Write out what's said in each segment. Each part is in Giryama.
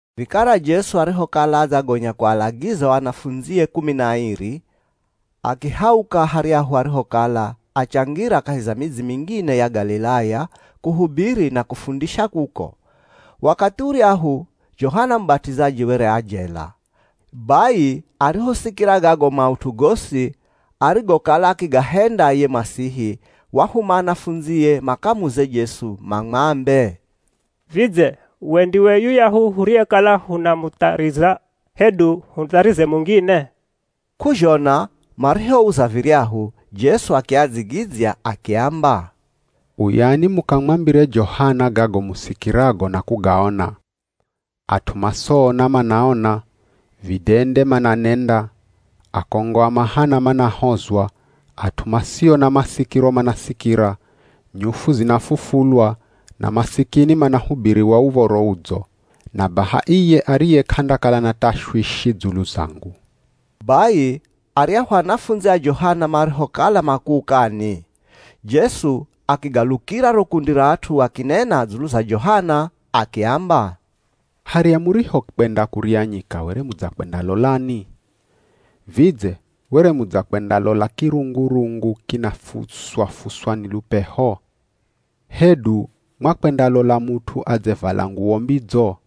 Vikara Jesu arihokala adzagonya kualagiza o anafundzie kumi na airi, akihauka haryahu arihokala, achangira kahi za midzi mingine ya Galilaya, kuhubiri na kufundisha kuko. Wakathi uryahu, Johana Mubat'izaji were a jela. Bai arihosikira gago maut'u gosi arigokala akigahenda ye Masihi, wahuma anafundzie makamuze Jesu mamwambe, “Vidze, we ndiwe yuyahu huriyekala hunamuthariza hedu hutharize mungine?” K'uzhona marihouza viryahu, Jesu akiadzigidzya akiamba, “Uyani mukamwambire Johana gago musikirago na kugaona. At'u masoona manaona, vidende mananenda, akongo a mahana manahozwa, at'u masio na masikiro manasikira, nyufu zinafufulwa, na masikini manahubiriwa Uv̱oro Udzo. Na baha iye ariye k'andakala na tashwishi dzulu zangu.” Bai aryahu anafundzi a Johana marihokala makuukani, Jesu akigalukira ro kundi ra at'u akinena dzulu za Johana akiamba, “Harya murihokwenda kurya nyika were mudzakwendalolani? Vidze were mudzakwendalola kirungurungu kinafuswa-fuswa ni lupeho? Hedu mwakwendalola mut'u adzevala nguwo mbidzo?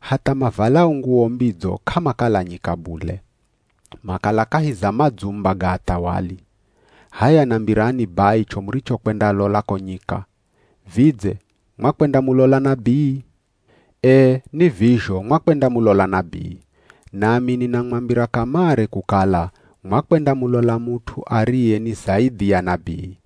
Hatha, mavalao nguwo mbidzo k'amakala nyika bule, makala kahi za madzumba ga athawali. H'aya nambirani bai cho murichokwendalola ko nyika. Vidze mwakwendamulola nabii? Ee, ni vizho mwakwendamulola nabii. Nami ninamwambira kamare kukala mwakwendamulola mut'u ariye ni zaidhi ya nabii.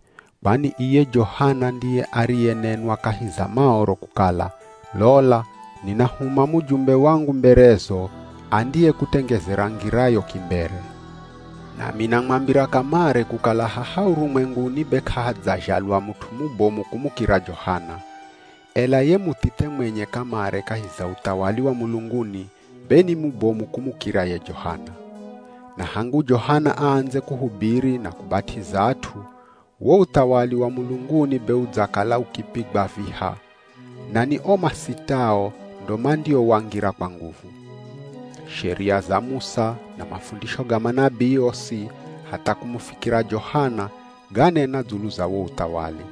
Kwani iye Johana ndiye ariyenenwa kahi za Maoro kukala, ‘Lola ninahuma mujumbe wangu mberezo, andiyekutengezera ngirayo kimbere.’ Nami namwambira kamare kukala haha urumwenguni be k'ahadzazhalwa mut'u mubomu kumukira Johana, ela ye muthithe mwenye kamare kahi za uthawali wa mulunguni be ni mubomu kumukira ye Johana. Na hangu Johana aandze kuhubiri na kubat'iza at'u, wo uthawali wa mulunguni be udzakala ukipigwa viha, na ni o masitao ndo mandiowangira kwa nguvu. Sheria za Musa na mafundisho ga manabii osi hatha kumufikira Johana ganena dzulu za wo uthawali.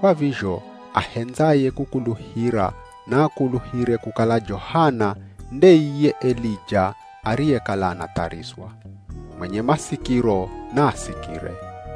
Kwa vizho ahendzaye kukuluhira naakuluhire kukala Johana nde iye Elija ariyekala anatharizwa. Mwenye masikiro, naasikire.”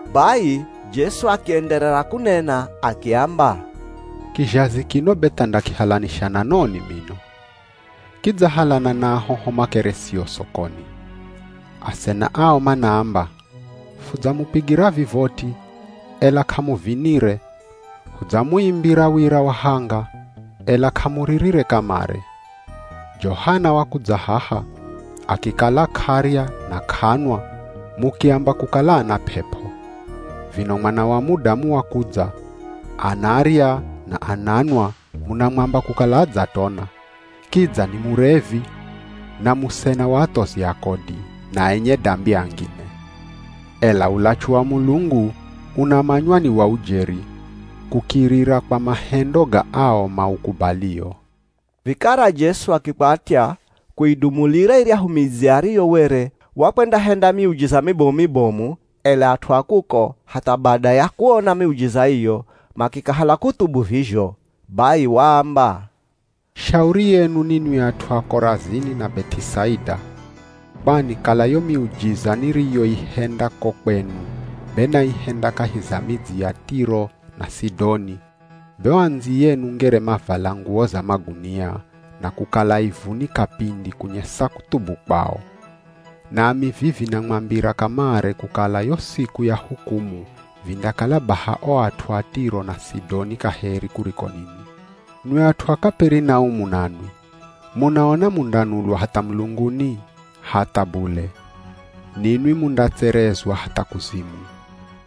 Bai Jesu akienderera kunena akiamba, “Kizhazi kino be tha ndakihalanisha na noni mino? Kidzahalana na ahoho makeresio sokoni. Asena ao manaamba, ‘Fudzamupigira vivoti, ela k'amuvinire, hudzamuimbira wira wa hanga, ela k'amuririre kamare.’ Johana wakudza haha, akikala k'arya na k'anwa mukiamba kukala ana p'ep'o. Vino Mwana wa Mudamu wakudza, anarya na ananwa munamwamba kukala adzatona, kidza ni murevi na musena wa athozi a kodi, na enye dambi angine. Ela ulachu wa Mulungu unamanywa ni wa ujeri, kukirira kwa mahendo ga ao maukubalio.” Vikara Jesu akikwatya kuidumulira iryahu midzi ariyo were wakwendahenda miujiza mibomu-mibomu, ela at'u a kuko hatha bada ya kuona miujiza iyo, makikahala kuthubu vizho. Bai waamba, “Shauri yenu ninwi at'u a Korazini na Beth'isaida. Kwani kala yo miujiza niriyoihenda ko kwenu be naihenda kahi za midzi ya Tiro na Sidoni be o andziyenu ngere mavala nguwo za magunia, na kukala ivuni kapindi kunyesa kuthubu kwao. Nami vivi namwambira kamare kukala yo siku ya hukumu vindakala baha o at'u a Tiro na Sidoni kaheri kuriko ninwi. Nwi at'u a Kaperinaumu nanwi, munaona mundanulwa hatha mulunguni? Hatha bule. Ninwi mundatserezwa hatha kuzimu.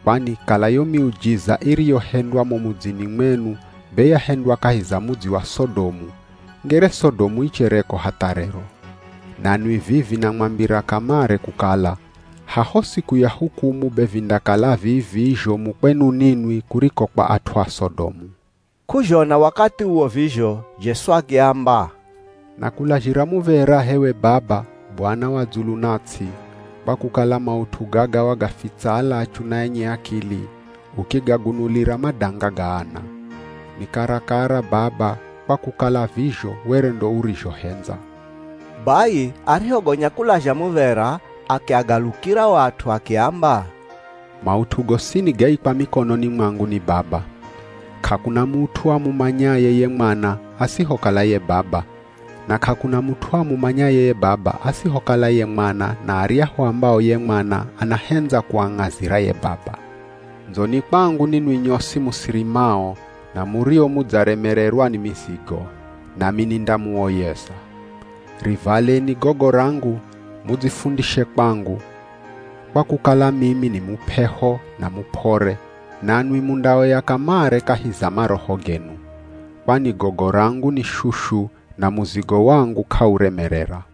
Kwani kala yo miujiza iriyohendwa mo mudzini mwenu be yahendwa kahi za mudzi wa Sodomu, ngere Sodomu ichereko hatha rero. Nanwi vivi namwambira kamare kukala, haho siku ya hukumu be vindakala vii-vii zhomu kwenu ninwi kuriko kwa at'u a Sodomu.” K'uzhona wakathi uwo vizho, Jesu akiamba, “Nakulazhira muv̱era h'ewe Baba, Bwana wa dzulu na ts'i, kwa kukala maut'u gaga wagafitsa alachu na enye akili, ukigagunulira madanga ga ana. Ni karakara Baba kwa kukala vizho were ndo urizhohendza.” Bai arihogonya kulazha muv̱era akiagalukira o at'u akiamba, “Maut'u gosini gaikwa mikononi mwangu ni Baba. K'akuna mut'u amumanyaye ye Mwana asihokala ye Baba, na k'akuna mut'u amumanyaye ye Baba asihokala ye Mwana na aryahu ambao ye Mwana anahendza kuang'azira ye Baba.” “Ndzoni kwangu ninwi nyosi musirimao, na murio mudzaremererwa ni mizigo nami nindamuoyeza. Rivaleni gogo rangu, mudzifundishe kwangu, kwa kukala mimi ni mup'eho na mup'ore, nanwi mundaoya kamare kahi za maroho genu. Kwani gogo rangu ni shushu na muzigo wangu k'auremerera.”